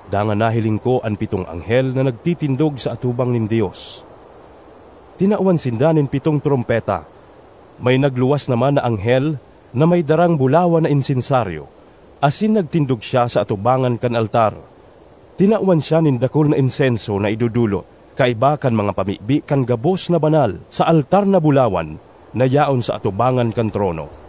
Dangan nahiling ko an pitong anghel na nagtitindog sa atubang nin Dios; tinawan sinda nin pitong trompeta. May nagluwas naman na anghel na may darang bulawan na insensaryo asin nagtindog siya sa atubangan kan altar; tinawan siya nin dakul na insenso na idodolot, kaiba kan mga pamibi kan gabos na banal, sa altar na bulawan na yaon sa atubangan kan trono.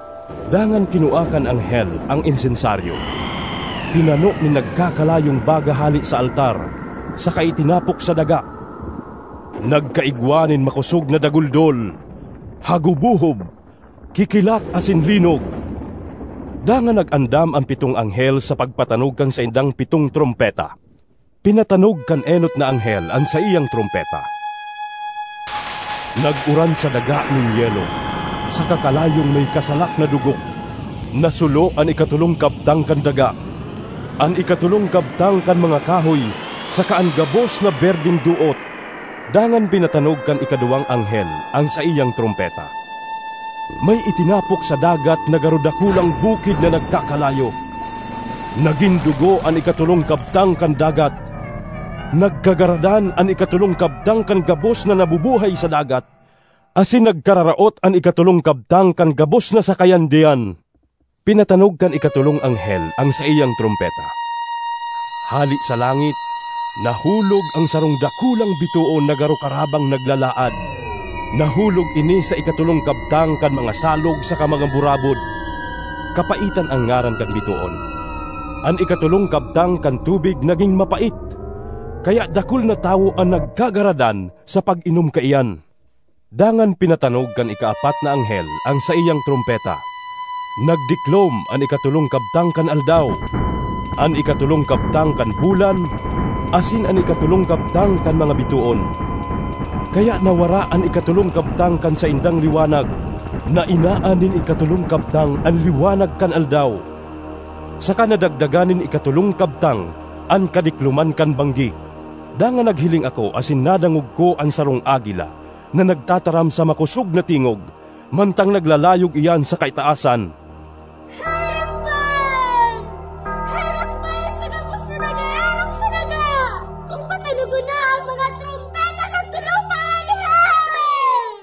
Dangan kinua kan anghel an insensaryo, pinano nin nagkakalayong baga hale sa altar, saka itinapok sa daga. Nagkaigwa nin makosog na daguldol, hagubohob, kikilat asin linog. Dangan nag-andam an pitong anghel sa pagpatanog kan saindang pitong trompeta. Pinatanog kan enot na anghel an saiyang trompeta. Nag-uran sa daga nin yelo saka kalayong may kasalak na dugo. Nasulo an ikatolong kabtang kan daga, an ikatolong kabtang kan mga kahoy saka an gabos na berdeng doot. Dangan pinatanog kan ikaduwang anghel an saiyang trompeta. May itinapok sa dagat na garo dakulang bukid na nagkakalayo. Nagin dugo an ikatolong kabtang kan dagat; nagkagaradan an ikatolong kabtang kan gabos na nabubuhay sa dagat, asin nagkararaot an ikatolong kabtang kan gabos na sakayan diyan. Pinatanog kan ikatolong anghel an saiyang trompeta. Hale sa langit, nahulog an sarong dakulang bitoon na garo karabang naglalaad; nahulog ini sa ikatolong kabtang kan mga salog saka mga burabod. (Kapaitan an ngaran kan bitoon.) An ikatolong kabtang kan tubig nagin mapait, kaya dakul na tawo an nagkagaradan sa pag-inom kaiyan. Dangan pinatanog kan ikaapat na anghel an saiyang trompeta. Nagdiklom an ikatolong kabtang kan aldaw, an ikatolong kabtang kan bulan asin an ikatolong kabtang kan mga bitoon, kaya nawara an ikatolong kabtang kan saindang liwanag. Nainaan nin ikatolong kabtang an liwanag kan aldaw, saka nadagdagan nin ikatolong kabtang an kadikloman kan banggi. Dangan naghiling ako asin nadangog ko an sarong agila na nagtataram sa makosog na tingog, mantang naglalayog iyan sa kaitaasan, “Herak man! Herak man sa gabos na nag-eerok sa daga kun patanogon na an mga trompeta kan tolo pang anghel!”